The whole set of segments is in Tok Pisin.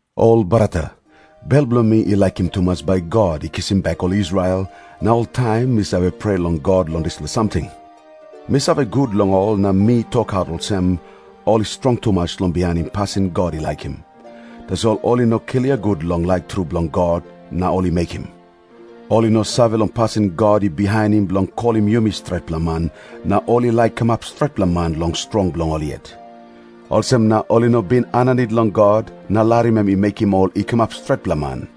Ol brata, bel bilong mi i laikim tumas bai God i kisim bek ol Israel, na oltaim mi save prea long God long dispela samting. Mi save gut long ol na mi tokaut olsem, ol i strong tumas long bihainim pasin God i laikim. Tasol ol i no klia gut long laik tru bilong God, na ol i mekim. Ol i no save long pasin God i bihainim bilong kolim yumi stretpela man, na ol i laik kamap stretpela man long strong bilong ol yet. Olsem na ol i no bin aninit long God na larim em i mekim ol i kamap stretpela man.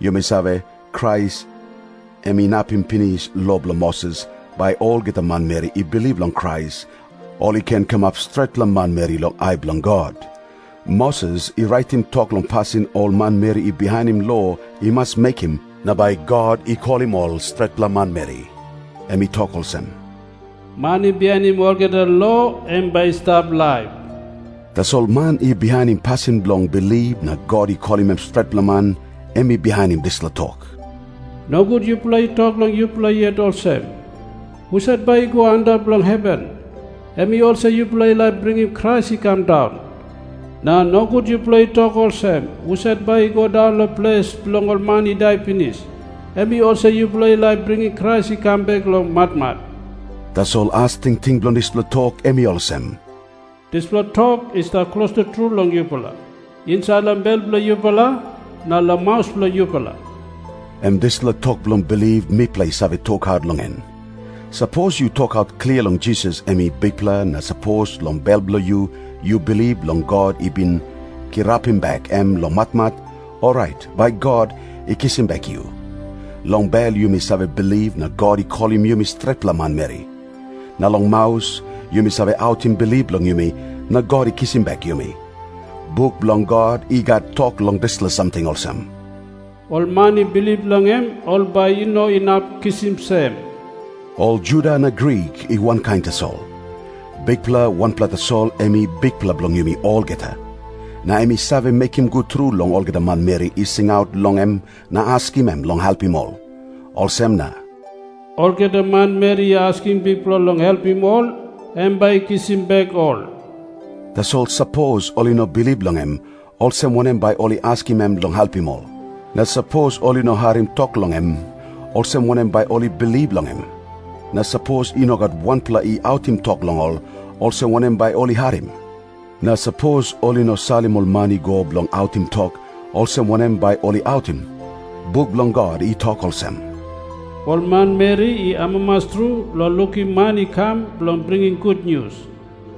Yumi save, Krais em inapim pinis lo bilong Moses, bai olgeta manmeri i bilip long Krais, ol i ken kamap stretpela manmeri long ai bilong God. Moses i raitim tok long pasin ol manmeri i bihainim lo i mas mekim na bai God i kolim ol stretpela manmeri. Em i tok olsem, "Man i bihainim olgeta lo, em bai i stap laip." Tasol man i bihainim pasin bilong bilip na God i kolim em stretpela man, em i bihainim dispela tok, "Nogut yupela i tok long yupela yet olsem, 'Husat bai i go antap long heven?'" Em i olsem yupela i laik bringim Krais i kam daun. "Na nogut yupela i tok olsem, 'Husat bai i go daun long ples bilong ol man i dai pinis?'" Em i olsem yupela i laik bringim Krais i kam bek long matmat. Tasol as tingting bilong dispela tok em i olsem, "Dispela tok i stap klostu tru long yupela, insait long bel bilong yupela, na long maus bilong yupela." Em dispela tok bilong bilip mipela i save tokaut long en. Sapos yu tokaut klia long Jisas em i Bikpela, na sapos long bel bilong yu yu bilip long God i bin kirapim bek em long matmat, orait bai God i kisim bek yu. Long bel yumi save bilip na God i kolim yumi stretpela manmeri. Na long maus yumi save autim bilip bilong yumi na God i kisim bek yumi. Buk bilong God i gat tok long dispela samting olsem, "Ol man i bilip long em, ol bai i no inap kisim sem." Ol Juda na Grik i wankain tasol. Bikpela wanpela tasol em I Bikpela bilong yumi olgeta. Na em i save mekim gut tru long olgeta manmeri i singaut long em na askim em long helpim ol. Olsem na "olgeta manmeri i askim Bikpela long helpim ol, em bai i kisim bek ol." Tasol sapos ol i no bilip long em, olsem wanem bai ol i askim em long helpim ol. Na sapos ol i no harim tok long em, olsem wanem bai ol i bilip long em? Na sapos i no gat wanpela i autim tok long ol, olsem wanem bai ol i harim? Na sapos ol i no salim ol man i go bilong autim tok, olsem wanem bai ol i autim? Buk bilong God i tok olsem, "Ol manmeri i amamas tru long lukim man i kam bilong bringim gutnius."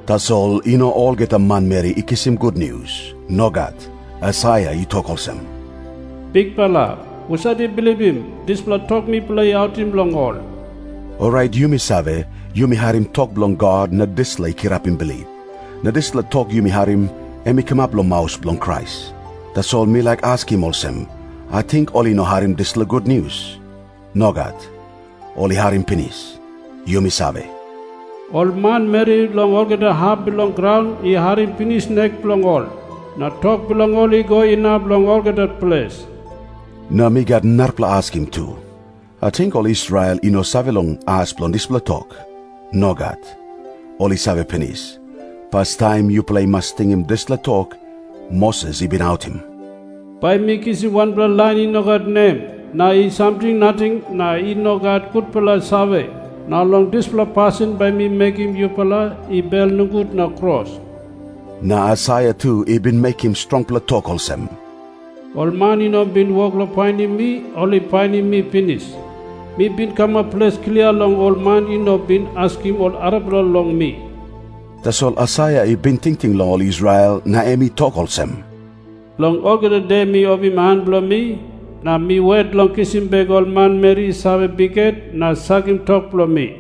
Tasol i no olgeta manmeri i kisim gutnius. Nogat. Aisaia i tok olsem, "Bikpela, husat i bilipim dispela tok mipela I autim long ol?" Orait yumi save, yumi harim tok bilong God na dispela i kirapim bilip. Na dispela tok yumi harim, em i kamap long maus bilong Krais. Tasol mi laik askim olsem, ating ol i no harim dispela gutnius? Nogat. Ol i harim pinis. Yumi save, "Ol manmeri long olgeta hap bilong graun i harim pinis nek bilong ol. Na tok bilong ol i go inap long olgeta ples." Na mi gat narapela askim tu. Ating ol Israel i no save long as bilong dispela tok? Nogat. Ol i save pinis. Pastaim yupela i mas tingim dispela tok Moses i bin autim, "Bai mi kisim wanpela lain i no gat nem na i samting nating na i no gat gutpela save, na long dispela pasin bai mi mekim yupela i bel nogut na kros." Na Aisaia tu i bin mekim strongpela tok olsem, "Ol man I no bin wok long painim mi, ol i painim mi pinis. Mi bin kamap ples klia long ol man i no bin askim ol arapela long mi." Tasol Aisaia I bin tingting long ol Israel na em i tok olsem, "Long olgeta de mi opim han bilong mi na mi wet long kisim bek ol manmeri i save bikhet na sakim tok bilong mi."